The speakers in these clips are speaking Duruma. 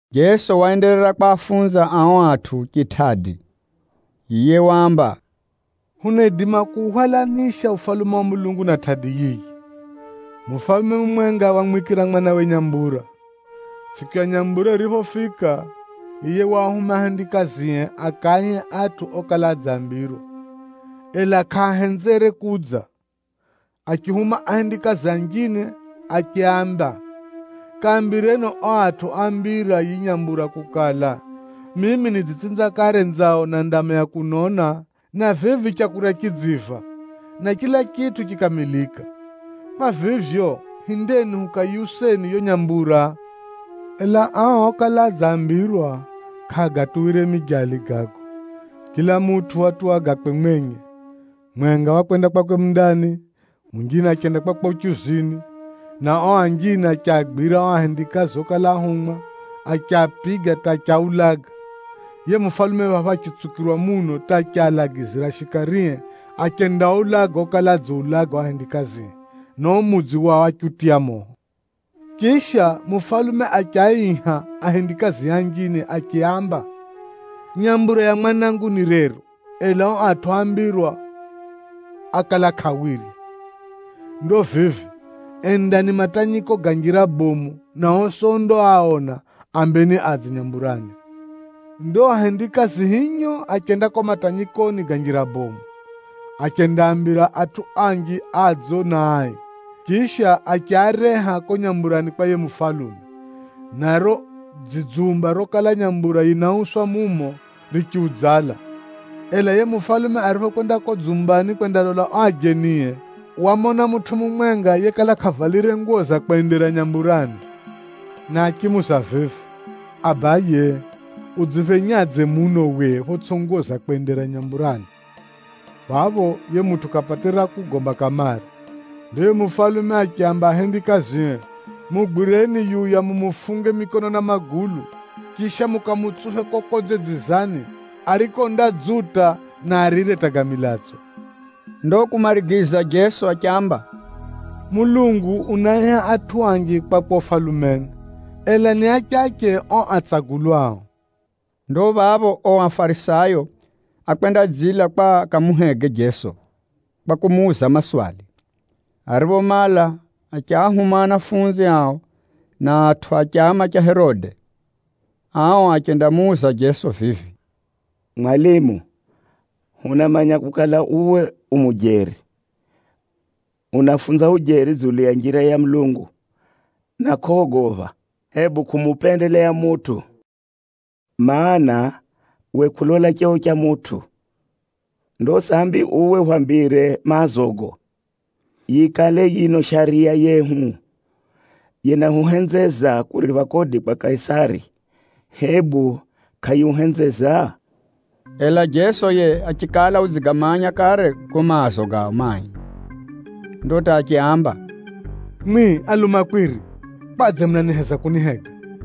Jeso waenderera kwafunza ao atʼu chitʼadi. Yiye waamba, “Hunaidima kuuhwalanisha Ufalume wa Mulungu na tʼadi yiyi. Mufalume mumwenga wamwikira mwanawe nyambura. Tsʼiku ya nyambura yiriphofika, yiye waahuma ahendikazie akaaihe atʼu okala adzambirwa, ela kʼaahenzere kudza. Achihuma ahendikazie anjine achiaamba, ‘Kaambireni ao atʼu oambira yiyi nyambura kukala, mimi nidzitsinza kare nzao na ndama ya kunona, na vivi leu ridziiva, na chila chitʼu chikamilika. Kwa vivyo, hindeni hukayiuseni yo nyambura.’ Ela ao okala adzambirwa, kʼaagatuwire mijali gago. Chila mutʼu watuwa gakwe mwenye. Mumwenga wakwenda kwakwe mundani, munjine achenda kwakwe uchuzini, na ao anjine achiagwira ao ahendikazi okala áhumwa, achiapiga hata achiaulaga. Yiye mufalume phapho achitsukirwa muno hata achialagiza shikarie achendaaulaga okala adziulaga ao ahendikazie, na uo mudzi wao achiutiya moho. Chisha, mufalume achiaiha ahendikazie anjine achiaamba, ‘Nyambura ya mwanangu ni rero, ela ao atʼu oambira ákala kʼaawirya. Ndo vivi, endani matanyiko ga njira bomu, na osi ondaaona, aambeni adze nyamburani.’ Ndo ahendikazi hinyo achenda kuko matanyikoni ga njira bomu, achendaambira atʼu anji adzo na ai, chisha achiareha kuko nyamburani kwa yiye mufalume, na riro dzidzumba rokala nyambura yinauswa mumo, richiudzala. Ela yiye mufalume ariphokwenda kuko dzumbani kwendalola ao ajenie, wamona mutʼu mumwenga yekala kʼavalire nguwo za kwendera nyamburani, na achimuuza vivi, ‘Abaye, udziphenyadze muno uwe photsʼi nguwo za kwendera nyamburani?’ Phapho, yiye mutʼu kʼapatire ra kugomba kamare. Ndo yiye mufalume achiaamba ahendikazie, ‘Mugwireni yuya mumufunge mikono na magulu, chisha mukamutsuphe kuko konze dzizani, ariko undadzuta, na arire hata ga milatso.’” Ndo kumarigiza Jeso achiamba, “Mulungu unaaiha atʼu anji kwakwe Ufalumeni, ela ni achache o atsagulwao.” Ndo phapho ao Afarisayo ákwendadzila kwa akamuhege Jeso kwa kumuuza maswali. Ariphomala, achiahuma anafunzi ao na atʼu a chama cha Herode. Ao achendamuuza Jeso vivi, “Mwalimu, hunamanya kukala uwe u mujeri, unafunza ujeri dzulu ya njira ya Mulungu, na kʼogopha, hebu kumupendeleya mutʼu, mana, uwe kʼulola cheo cha mutʼu. Ndo sambi uwe hwambire maazogo. Yikale yino Shariya yehu yinahuhenzeza kuripha kodi kwa Kaisari, hebu kʼayihuhenzeza?” Ela Jeso yiye achikala udzigamanya kare gago maazo gao mai. Ndo hata achiaamba, “Mwimwi alumakwiri, kwadze munaheza kunihega?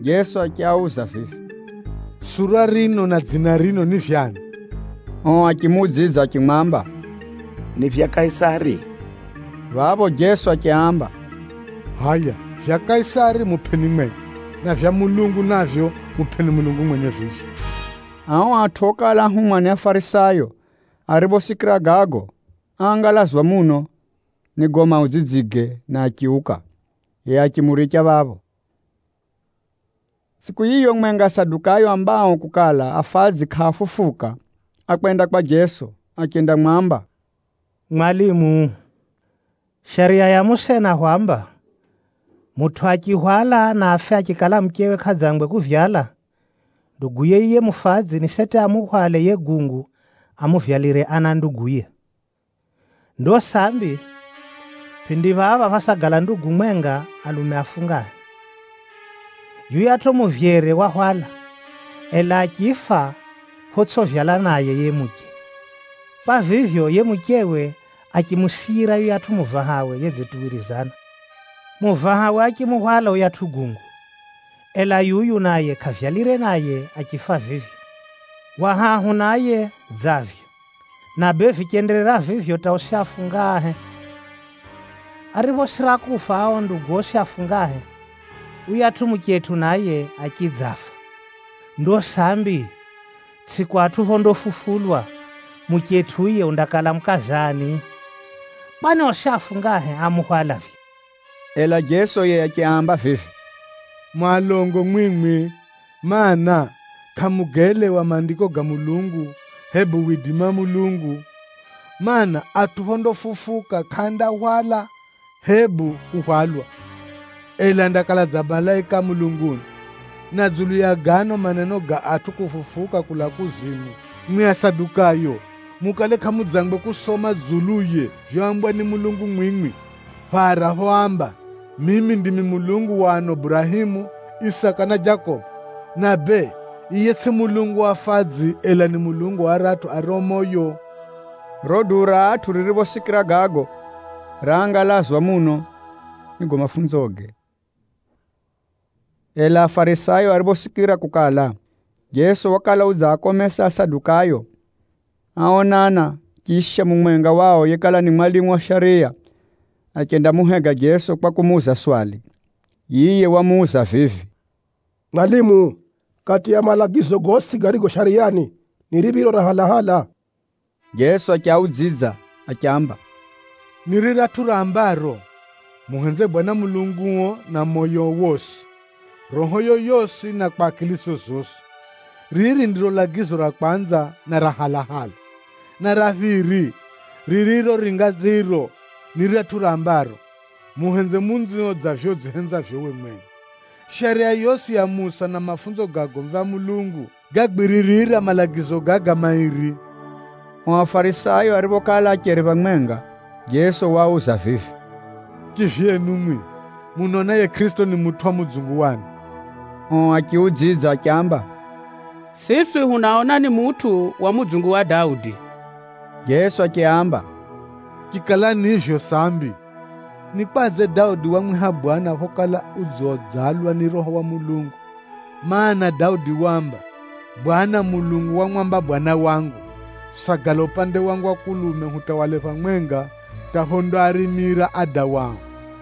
Jeso achiauza vivi, “Sura rino na dzina rino ni vyakwe ani?” Ao achimuudzidza achimwamba, “Ni vyakwe Kaisari.” Phapho Jeso achiaamba, “Hʼaya vyakwe Kaisari mupʼeni mwenye, na vyakwe Mulungu navyo mupʼeni Mulungu mwenye vivyo.” Ao atʼu okala áhumwa ni Afarisayo ariphosikira gago, áangalazwa muno ni gago maudzidzige na achiuka, yiye achimuricha phapho. Tsʼiku yiyo mwenga, Asadukayo aambao kukala afadzi kʼaafufuka, ákwenda kwa Jeso achendamwamba, “Mwalimu, Shariya ya Musa yinahwamba, ‘Mutʼu achihwala na afe achikala kʼadzangwe kupata mwana, nduguye yiye mufadzi ni seti amuhwale yiye gungu amuvyalire ana nduguye.’ Ndo sambi, pʼindi phapha phásagala ndugu mwenga, alume afungahe. Yuyatʼu muvyere wahwala, ela achifa photsʼivyala naye yiye muche. Kwa vivyo, yiye muchewe achimusiyira yuyatʼu muvahawe yedzituwirizana. Muvahawe achimuhwala yuyatʼu gungu, ela yuyu naye, kʼavyalire naye achifa vivyo. Wa hahu naye dza vivyo, na bee vichenderera vivyo hata osi afungahe. Ariphosira kufa ao ndugu osi afungahe, yuyatʼu muchetʼu naye achidzafa. Ndo sambi, tsʼiku atʼu phondafufulwa, muchetʼu yiye undakala mukaza ani? Kwani osi afungahe amuhwala vivyo!” Ela Jeso yiye achiaamba vivi, “Mu alongo mwimwi, mana, kʼamugaelewa Maandiko ga Mulungu, hebu widimi wa Mulungu! Maana, atʼu phondafufuka kʼaandahwala hebu kuhwalwa, ela andakala dza malaika a mulunguni. Na dzulu ya gano maneno ga atʼu kufufuka kulaa kuzimu, mwimwi Asadukayo mukale kʼamudzangwe kusoma dzuluye vyoambwa ni Mulungu mwimwi, phara phoamba, ‘Mimi ndimi Mulungu wa ano Burahemu, Isaka, na Jakobo!’ Na bee, yiye tsʼiye Mulungu wa afadzi, ela ni Mulungu wa aratʼu ario moyo.” Riro duu ra atʼu ririphosikira gago, raangalazwa muno ni gago mafunzoge. Ela Afarisayo ariphosikira kukala, Jeso wakala udziakomesa Asadukayo, áonana, chisha mumwenga wao yekala ni mwalimu wa shariya, achendamuhega Jeso kwa kumuuza swali. Yiye wamuuza vivi, “Mwalimu, kati ya malagizo gosi garigo Shariyani, ni riphiro ra halahala?” Jeso achiudzidza achiamba, “Ni riratʼu rambaro, ‘Muhenzeni Mwenyezi Mulungu, Mulungu wenu na moyo wenu wosi, na roho renu rosi na kwa akili zenu zosi.’ Riri ndiro lagizo ra kwanza, na ra halahala. Na ra phiri, ririro ringa riro, ni riratʼu rambaro, ‘Muhenze jiranio dza vivyo udzihenzavyo uwe mwenye!’ Shariya zosi za Musa na mafunzo ga agomvi a Mulungu, ganategemea malagizo gaga mairi.” O Afarisayo ariphokala acheri phamwenga, Jeso waauza vivi, “Chivyenu mwimwi, munaona yiye Kʼirisito ni mutʼu wa mudzungu wa ani?” Ao achiudzidza achiamba, “Siswi hunaona ni mutʼu wa mudzungu wa Daudi.” Jeso achiaamba, “Chikala ni vivyo sambi, ni kwadze Daudi wamwiha Bwana phokala udziudzalwa ni Roho wa Mulungu? Maana, Daudi waamba, ‘Bwana Mulungu wamwamba Bwana wangu: “Sagala upande wangu wa mukono wa kulume, hata phondakuhenda warime tsetsetse adawao.” ’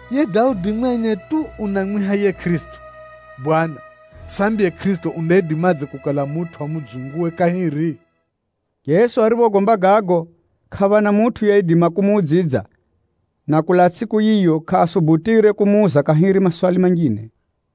“Yiye Daudi mwenye tu unamwiha yiye Kʼirisito, ‘Bwana,’ sambi yiye Kʼirisito unaidimadze kukala mutʼu wa mudzunguwe kahiri?” Jeso ariphogomba gago, kʼaphana mutʼu yeidima kumuudzidza. Na kulaa tsʼiku yiyo, kʼaasubutire kumuuza kahiri maswali manjine.